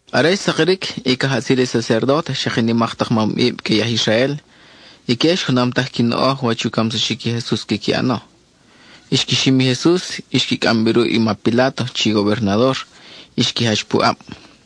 Are xsakiric, i cajʼatzil i sacerdóte xak i nimak tak mamʼib que i aj Israel, ique xjunamtaj qui noʼoj wach u camsaxic i Jesus quiqui ʼano. Xqui xim i Jesus y xqui cʼam bi ruʼ i ma Piláto chi gobernador, y xqui jach puʼab.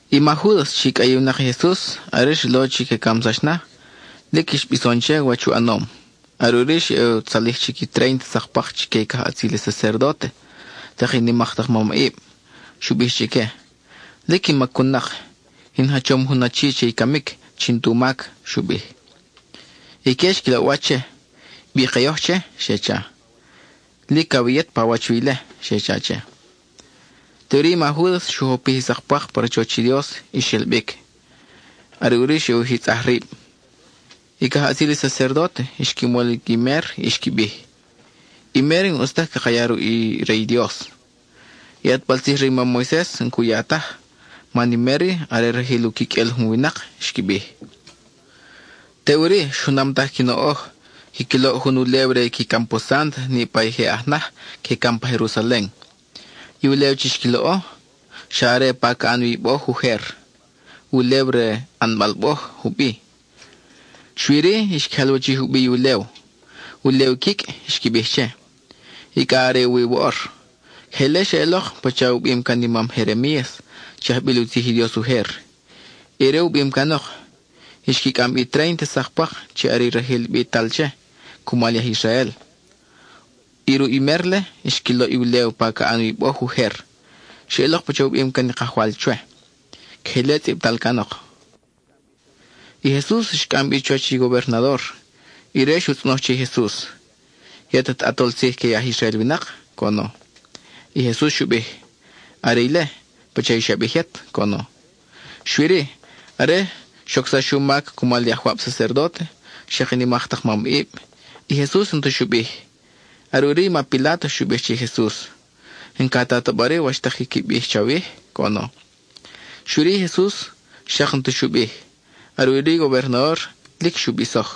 I ma Júdas, chi cʼayiwnak i Jesus, are xrilo chi ca camsax na, lic xbison che wach u ʼanom. Are ʼuri xa ʼe u tzalij chic i tréinta sak pwak chique i cajʼatzil i sacerdóte, tak i nimak tak mamʼib. Xu bij chique: —Lic in macun-nak; in jachom jun achi che i camic chi n-tu mac —xu bij. Ique xqui laʼ u wach che: —¿Bi ke-yoj che? —xe cha—. ¡Lic awe yet pa wach wi ile! —xe cha che. Teʼuri i ma Júdas xu jopij i sak pwak pa rachoch i Dios y xel bic. Are ʼuri xa ʼe u jitzʼaj rib. I cajʼatzil i sacerdóte xqui mol i mer y xqui bij: —I mer-i, n-ʼus taj caka ya ruʼ i re i Dios; i ʼatbal tzij re i mam Moises n-cu ya taj, man i mer-i are i rajil u quiqʼuel jun winak —xqui bij. Teʼuri xjunamtaj qui noʼoj quiqui loʼ jun ulew re i qui camposant niʼpa i je aj naj que cam pa Jerusalen. I ulew chi xqui loʼo, xa are pa ca ʼan wi boj ujer; “Ulew re ʼAnbal Boj” u bi. Xui-ri, xqui jalwachij u bi i ulew; “Ulew Quicʼ” xqui bij che, y cʼa are ʼo wi woʼor. Queje ile xeʼelok pacha u bim can i mam Jeremías, chi ajbil u tzij i Dios ujer. Ire u bim canok: “Xqui cʼam bi i tréinta sak pwak chi are i rajil bital che cumal i aj Israel; y ruʼ i mer-le xqui loʼ i ulew pa ca ʼan wi boj ujer. Xeʼelok pacha u bim can i Kajwal chwe.” Queje ile tzʼibtal canok. I Jesus xcʼam bi chuwach i gobernador. Ire xu tzʼonoj che i Jesus: —¿Yet at ʼatol tzij que i aj Israel winak? —coʼono. I Jesus xu bij: —Are ile, pacha i xa bij yet —coʼono. Xui-ri, are xocsax u mac cumal i ajwab sacerdóte, xak i nimak tak mamʼib, i Jesus n-ta xu bij. Are ʼuri i ma Piláto xu bij che i Jesus: —¿N-ca ta ta-bari wach tak quiqui bij chawij? —coʼono. Xui-ri, i Jesus xak n-ta xu bij. Are ʼuri, i gobernador lic xu bisoj.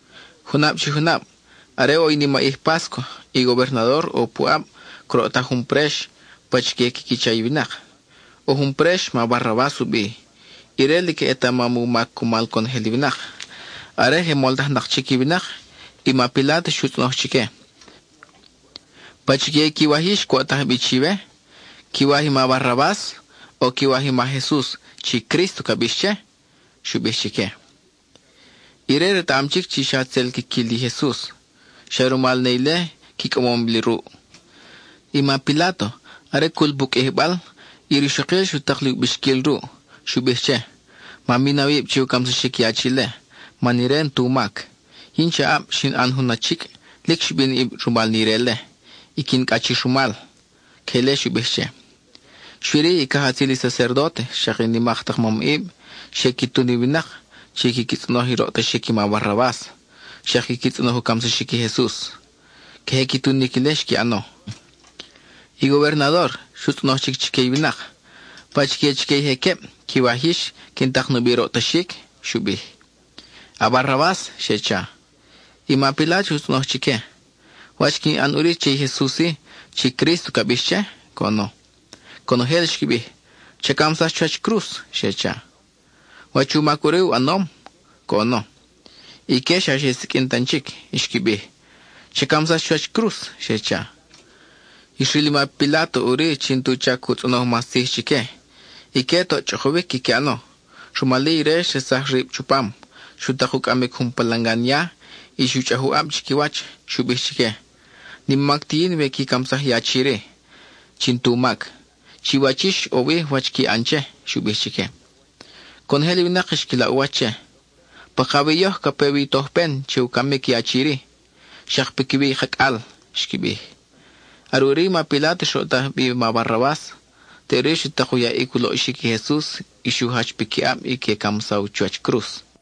Junab chi junab, are ʼo i nimaʼij páscua, i gobernador ʼo puʼab croʼtaj jun prex, pachique quiqui cha i winak. ʼO jun prex, ma Barabas u bi, ire lic ʼetamam u mac cumal conojel i winak. Are je moltajnak chic i winak, i ma Piláto xu tzʼonoj chique: —¿Pachique quiwaj yix cwoʼtaj bi chiwe? ¿Quiwaj i ma Barabas? ¿O quiwaj i ma Jesus chi “Crísto” ca bix che? —xu bij chique. Ire retaʼam chic chi xa tzel quiquil i Jesus; xa rumal ne ile qui cʼamom lo ruʼ. I ma Piláto, are cul pu qʼuijibal, i rixokil xu tak li u bixquil ruʼ; xu bij che: “Ma min awib che u camsaxic i achi-le, man ire n-tu mac. Yin chaʼab xin ʼan jun achicʼ lic xibinʼib rumal ni ire-le y quin cʼachir rumal.” (Queje ile xbix che.) Xui-ri i cajʼatzil i sacerdóte, xak i nimak tak mamʼib, xe qui tun i winak chi quiqui tzʼonoj i roʼtaxic i ma Barabas, xak quiqui tzʼonoj u camsaxic i Jesus. Queje i qui tunic ile xqui ʼano. I gobernador xu tzʼonoj chic chique i winak: —¿Pachique chique i je queb quiwaj yix quin tak nubi roʼtaxic? —xu bij. —A-Barabas —xe cha. I ma Piláto xu tzʼonoj chique: —¿Wach quin ʼan ʼuri che i Jesus-i chi “Cristo” ca bix che? —coʼono. Conojel xqui bij: —¡Cha camsaj chuwach cruz! —xe cha. —¿Wach u mac ʼuri u ʼanom? —coʼono. Ique xa xe siqʼuin tan chic; xqui bij: —¡Cha camsaj chuwach cruz! —xe cha. Xril i ma Piláto ʼuri chi n-tu chac cu tzʼonoj mas tzij chique. Ique toʼ chʼokowic quiqui ʼano. Rumal-i ire xresaj rib chupam; xu tak u cʼamic jun palangan ya, y xu chʼaj u ʼab chiquiwach. Xu bij chique: —N-in mac ti yin we qui camsaj i achi-ri chi n-tu mac. Chiwach yix ʼo wi wach qui ʼan che —xu bij chique. Conojel i winak xqui laʼ u wach che: —¡Pakawi yoj ca pe wi i tojpen che u camic i achi-ri! ¡Xak piquiwi i kacʼal! —xqui bij. Are ʼuri i ma Piláto xroʼtaj bi a-Barabas; teʼuri xu tak u yaʼic u loʼxic i Jesus y xu jach bi piquiʼab i que camsaw chuwach cruz.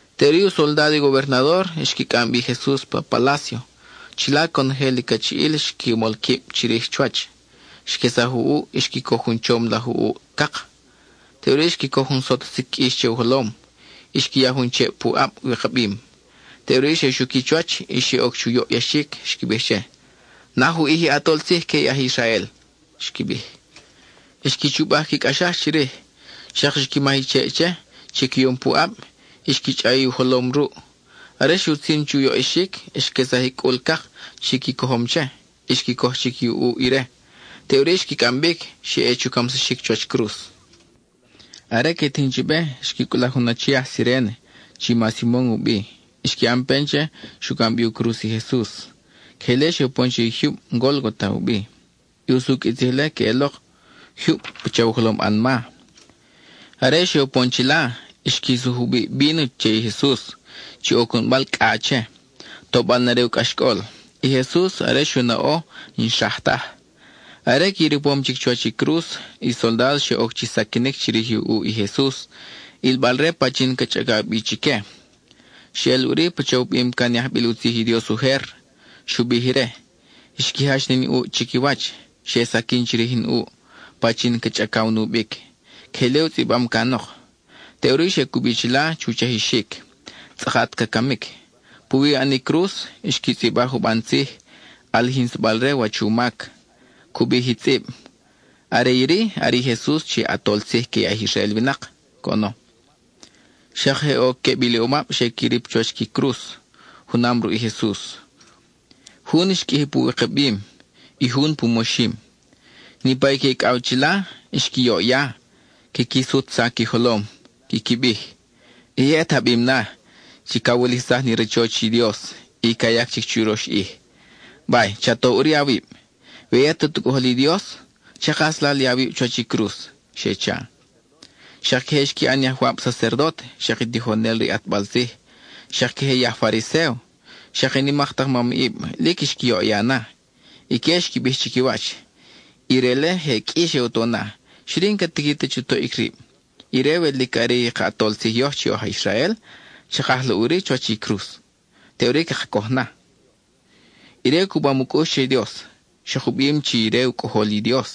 Teʼuri i u soldádo i gobernador xqui cʼam bi i Jesus pa palácio. Chila conojel i cachiʼil xqui mol quib chirij chuwach. Xquesaj u ʼuʼ y xqui coj jun chom laj u ʼuʼ cak. Teʼuri xqui coj jun sotosic qʼuix che u jolom, y xqui ya jun cheʼ puʼab wikabim. Teʼuri xe xuqui chuwach, y xe oc chu yoʼyaxic; xqui bij: —¡Naj u ʼij i ʼatol tzij que i aj Israel! —xqui bij. Xqui chubaj qui cʼaxaj chirij, xak xqui maj i cheʼ che, chi qui yom puʼab, y xqui chʼay u jolom ruʼ. Are xe utzin chu yoʼyaxic, xquesaj i cʼul cak chi qui cojom che, y xqui coj chic i u ʼuʼ ire. Teʼuri xqui cʼam bic, xe ʼe chu camsaxic chuwach cruz. Are que tijin chi be, xqui cʼulaj jun achi aj Ciréne, chi ma Simon u bi. Xqui ʼan pen che, xu cʼam bi u cruz i Jesus. Queje ile xe upon che jun jyub, Gólgota u bi; i usucʼ i tzij-le queʼelok: “jyub pacha u jolom anma.” Are xe upon chila, xqui sujuj jubiʼ víno che i Jesus, chi ʼo cunbal cʼa che, tobal na re u cʼaxcʼol. I Jesus, are xu naʼo, n-xraj taj. Are qui ripom chic chuwach i cruz, i soldádo xe oc chi saquinic chirij u ʼuʼ i Jesus, ʼilbal-re pachin ca chʼacaw bi chique. Xeʼel ʼuri pacha u bim can i ajbil u tzij i Dios ujer. Xu bij ire: “Xqui jach na in ʼuʼ chiquiwach; xe saquin chirij in ʼuʼ, pachin ca chʼacaw nubic.” Queje ile u tzʼibam canok. Teʼuri xe cubi chila chu chajixic, tzʼakat ca camic. Puwi ʼan i cruz xqui tzʼibaj juban tzij, ʼalijinsabal-re wach u mac. Cu bij i tzʼib: “Are iri, are i Jesus, chi ʼatol tzij que i aj Israel winak,” coʼono. Xak je ʼo queb iliʼomab xe qui rip chuwach qui cruz, junam ruʼ i Jesus. Jun xqʼuiji pu wikabim, y jun pu moxim. Niʼpa i que icʼaw chila, xqui yoʼya. Quiqui sutsa qui jolom y quiqui bij: —Yet a bim na chi ca wulijsaj ni rachoch i Dios, y ca yac chic churox ʼij. ¡Bay, cha to ʼuri awib! We yet at u Cʼojol i Dios, cha kajsaj li awib chuwach i cruz —xe cha. Xak queje xqui ʼan i ajwab sacerdóte, xak i tijonel re i ʼatbal tzij, xak queje i aj Fariséo, xak i nimak tak mamʼib, lic xqui yoʼya na. Ique xqui bij chiquiwach: —Ire-le je qʼui xe u to na, xui-ri n-ca tiqui ta chu toʼic rib. Ire, we lic are i ka ʼatol tzij yoj chi oj aj Israel, cha kaj lo ʼuri chuwach i cruz, teʼuri caka coj na. Ire u cubam u cʼux che i Dios, xak u bim chi ire u Cʼojol i Dios;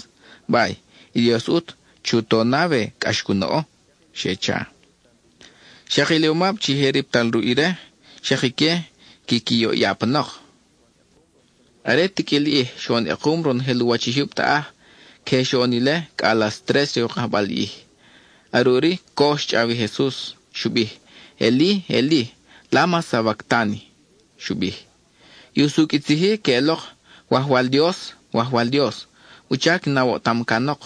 bay, i Dios ʼut chu to na we cʼax cu naʼo —xe cha. Xak i iliʼomab chi je riptal ruʼ ire, xak ique quiqui yoʼya panok. Are tiqʼuil ʼij, xoʼon ʼekum ronojel u wach i jyub taʼaj; queje xoʼon ile cʼa a las tres re u kajbal ʼij. Are ʼuri, co xchʼaw i Jesus, xu bij: —Eli, Eli, ¿láma sabactáni? —xu bij. I usucʼ i tzij-i queʼelok: Wajwal Dios, Wajwal Dios, ¿wuchac in awoʼtam canok?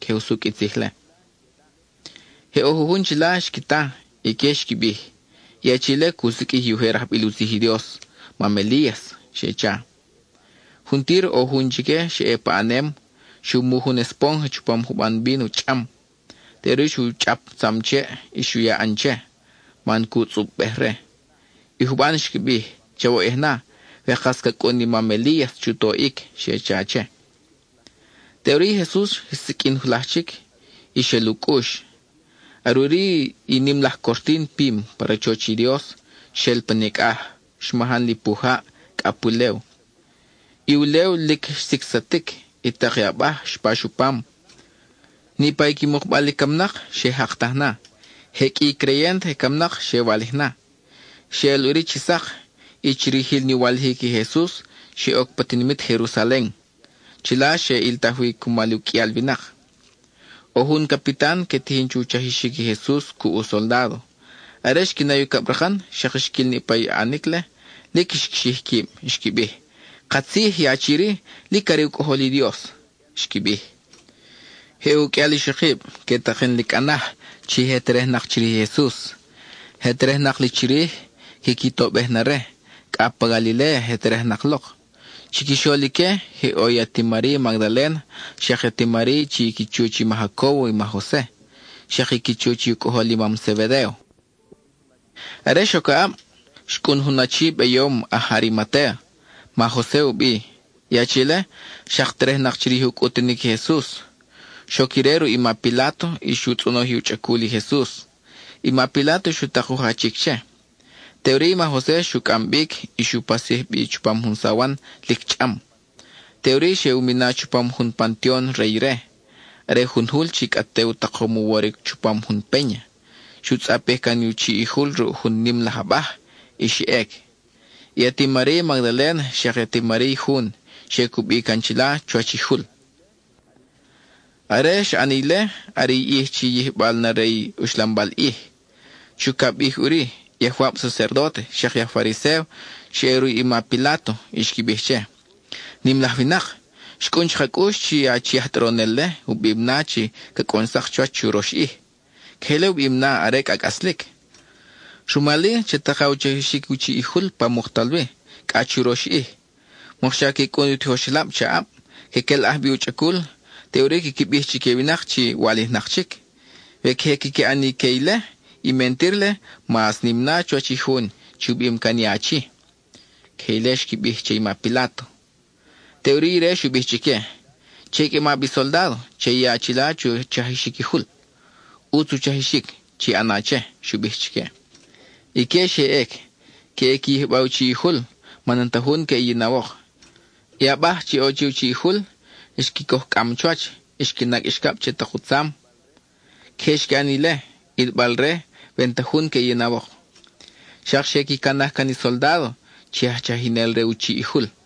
Queje usucʼ u tzij ile. Je ʼo jujun chila xqui ta; ique xqui bij: —I achi-le cu siqʼuij i ujer ajbil u tzij i Dios, mam Elías —xe cha. Juntir, ʼo jun chique xa ʼe paʼanem, xu mu jun espónja chupam juban víno chʼam. Teʼuri xu chʼap tzam cheʼ y xu ya ʼan che, man cu tzʼub-bej re. I juban xqui bij: —Chawoyʼej na, we kas ca cʼun i mam Elías chu toʼic —xe cha che. Teʼuri i Jesus xsiqʼuin julaj chic y xel u cʼux. Are ʼuri i nim laj cortin pim, pa rachoch i Dios, xel pa nicʼaj, xmajan li pujaʼ, cʼa pulew. I ulew lic xa sicsatic; i tak i abaj xpax u pam. Niʼpa i qui mukbal i camnak xe jaktaj na; je qʼui i creyent je camnak xe walij na. Xe ʼel ʼuri chi sak; y chirijil nu walijic i Jesus, xe oc pa tinimit Jerusalen. Chila xe ʼiltaj wi cumal uqʼuial winak. ʼO jun capitan que tijin chu chajixic i Jesus cuʼ u soldádo. Are xqui na i ucabrakan, xak xquil niʼpa i ʼanic-le, lic xqui xij quib. Xqui bij: —Katzij i achi-ri, lic are u Cʼojol i Dios —xqui bij. Je ʼo uqʼuial ixokib que taken li cʼa naj chi je terejnak chirij i Jesus. Je terejnak li chirij, quiqui tobej na re; cʼa pa Galiléa je terejnak lok. Chiquixol ique je ʼo i ati Mariy Magdaléna, xak i ati Mariy chi qui chuch i ma Jacóbo y ma Jose, xak i qui chuch i u cʼojol i mam Zebedéo. Are xoc aʼab, xcʼun jun achi beyom aj Arimatéa, ma Jose u bi. I achi-le xak terejnak chirij u cʼutunic i Jesus. Xoc ire ruʼ i ma Piláto y xu tzʼonoj i u chʼacul i Jesus. I ma Piláto xu tak u jachic che. Teʼuri i ma Jose xu cʼam bic y xu pasij bi chupam jun sawan lic chʼam. Teʼuri xe u mina chupam jun pantion re ire; are jun jul chi cʼa te u takom u woric chupam jun péña. Xu tzʼapij can u chiʼ i jul ruʼ jun nim laj abaj, y xa ʼec. I ati Mariy Magdaléna, xak i ati Mariy jun, xe cubi can chila chuwach i jul. Are xa ʼani ile, are i ʼij chi yijbal na re i uxlambal ʼij. Chucab ʼij ʼuri, i ajwab sacerdóte, xak i aj Fariséo, xe ʼe ruʼ i ma Piláto y xqui bij che: —Nim laj winak, xcʼun chaka cʼux chi i achi aj tʼoronel-le u bim na chi ca cʼun sak chuwach churox ʼij. Queje ile u bim na are cʼa cʼaslic. Rumal-i cha taka u chajixic i jul pa muktal wi, cʼa churox ʼij. Mokxa que cʼun i u tijoxelab chaʼab, caquelʼaj bi u chʼacul, teʼuri quiqui bij chique i winak chi walijnak chic. We queje quiqui ʼan ni ique ile, i mentir-le mas nim na chuwach i-jun chi u bim can i achi. (Queje ile xqui bij che i ma Piláto.) Teʼuri ire xu bij chique: —Che i cʼama bi i soldádo; che i ya chila chu chajixic i jul. ʼUtz u chajixic chi ʼana che —xu bij chique. Ique xe ʼec, que ʼe qui yijba u chiʼ i jul man n-ta jun ca ʼe yinawok. I abaj chi ʼo che u chiʼ i jul, xqui coj cʼam chuwach, xqui nacʼ ixcab che tak u tzam. Queje xqui ʼan ile, ʼilbal-re we n-ta jun ca ʼe yinawok. Xak xe qui canaj can i soldádo chi je chajinel re u chiʼ i jul.